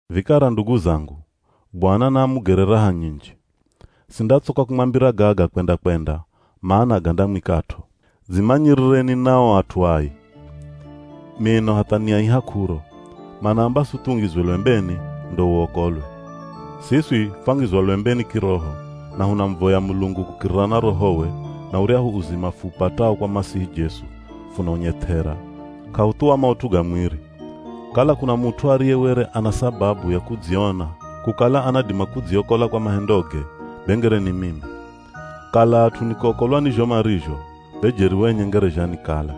Vikara ndugu zangu, Bwana na amugere raha nyinji. Sindatsoka kumwambira gaga kwenda-kwenda, mana gandamwikat'o. Dzimanyirireni na o at'u ai. Mino hatha niaiha k'uro. Manaamba suthi ungizwe lwembeni ndo uokolwe. Siswi fwangizwa lwembeni kiroho, na hunamuvoya Mulungu kukirira na Rohowe, na uryahu uzima fuupatao kwa Masihi Jesu, funaunyeth'era, k'ahuthuwa maut'u ga mwiri. Kala kuna mut'u ariye were ana sababu ya kudziona kukala anadima kudziokola kwa mahendoge, be ngere ni mimi. Kala at'u ni kuokolwa ni zho marizho, be jeri wenye ngere zhanikala.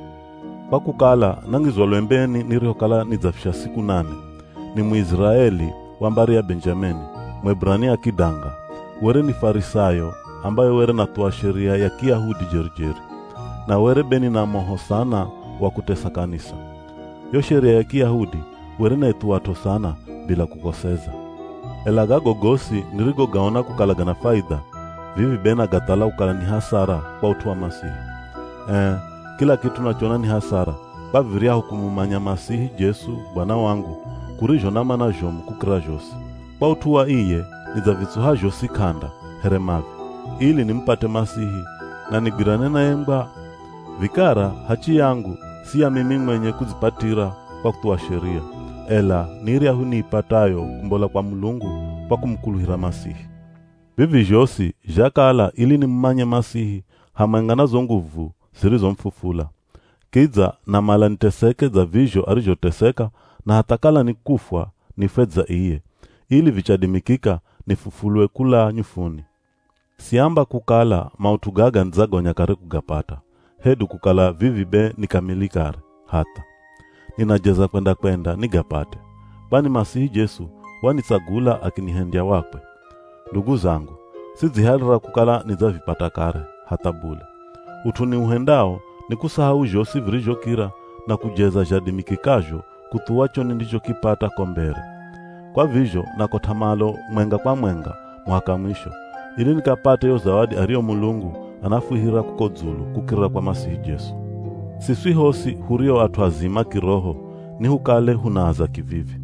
Kwa kukala nangizwa lwembeni nirihokala nidzafisha siku nane. Ni Muiziraeli, wa mbari ya Benjamini, Mueburania kidanga. Were ni Farisayo ambaye were nathuwa Sheria ya Kiyahudi jeri-jeri. Na were be nina moho sana wa kutesa kanisa. Yo Sheria ya Kiyahudi were naithuwat'o sana, bila kukoseza. Ela gago gosi nirigogaona kukala gana faidha, vivi be nagathala kukala ni hasara kwa ut'u wa Masihi. Ee, kila kit'u nachona ni hasara kwa viryahu kumumanya Masihi Jesu Bwana wangu, kurizho na mana zhomu kukira zhosi. Kwa ut'u wa iye nidzavitsuha zhosi k'anda, here mavi, ili nimupate Masihi na nigwirane naye ngwa. Vikara hachi yangu si ya mimi mwenye kudzipatira kwa kuthuwa Sheria, ela ni iryahu niipatayo kumbola kwa Mulungu kwa kumukuluhira Masihi. Vivi zhosi zhakala ili nimumanye Masihi hamwenga na zo nguvu zirizomufufula. Kidza namala niteseke dza vizho arizhoteseka na hatha kala ni kufwa nifwe dza iye, ili vichadimikika nifufulwe kula nyufuni. Siamba kukala maut'u gaga nidzagonya kare kugapata, hedu kukala vivi be ni kamili kare, hatha. Ninajeza kwenda-kwenda nigapate, kwani Masihi Jesu wanitsagula akinihendya wakwe. Ndugu zangu, sidzihalira kukala nidzavipata kare, hatha bule. Ut'u niuhendao ni kusahau zhosi virizhokira na kujeza zhadimikikazho kuthuwa cho nindichokipata ko mbere. Kwa vizho nakot'a malo mwenga kwa mwenga muhaka mwisho, ili nikapate yo zawadi ariyo Mulungu anafwihira kuko dzulu kukirira kwa Masihi Jesu. Siswi hosi hurio at'u azima kiroho nihukale hunaaza kivivi.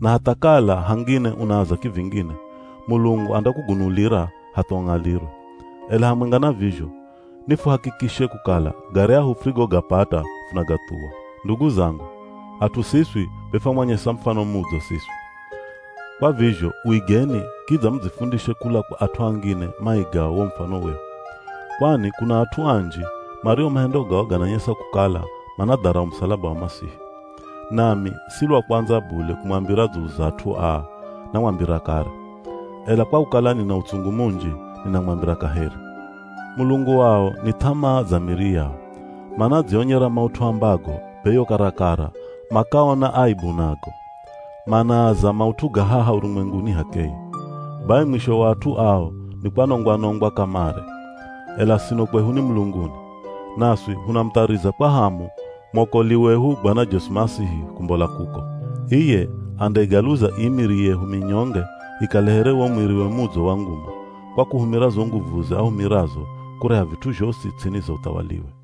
Na hatha kala hangine unaaza kivingine, Mulungu andakugunulira hatha ung'alirwe. Ela hamwenga na vizho, nifuhakikishe kukala garyahu furigogapata, funagathuwa. Ndugu zangu, at'u siswi be fwamwanyesa mufano mudzo siswi. Kwa vizho uigeni kidza mudzifundishe kula kwa at'u angine maigao wo mufano wehu. Kwani kuna at'u anji mario mahendo gao gananyesa kukala manadharau musalaba wa Masihi. Nami si lwa kwandza bule kumwambira dzulu za at'u aa, namwambira kare. Ela kwa kukala nina utsungu munji, ninamwambira kaheri. Mulungu wao ni th'amaa za miri yao. Manadzionyera maut'u ambago be yo karakara makaona aebu nago. Manaaza maut'u ga haha urumwenguni h'akeye. Bai mwisho wa at'u ao ni kwanongwa-nongwa kamare. Ela sino kwehu ni mulunguni. Naswi hunamuthariza kwa hamu mwokoli wehu Bwana Jesu Masihi kumbola kuko. Iye andaigaluza ii miri yehu minyonge ikale here wo mwiriwe mudzo wa nguma, kwa kuhumira zo nguvuze ahumirazo kureha vit'u zhosi ts'ini za uthawaliwe.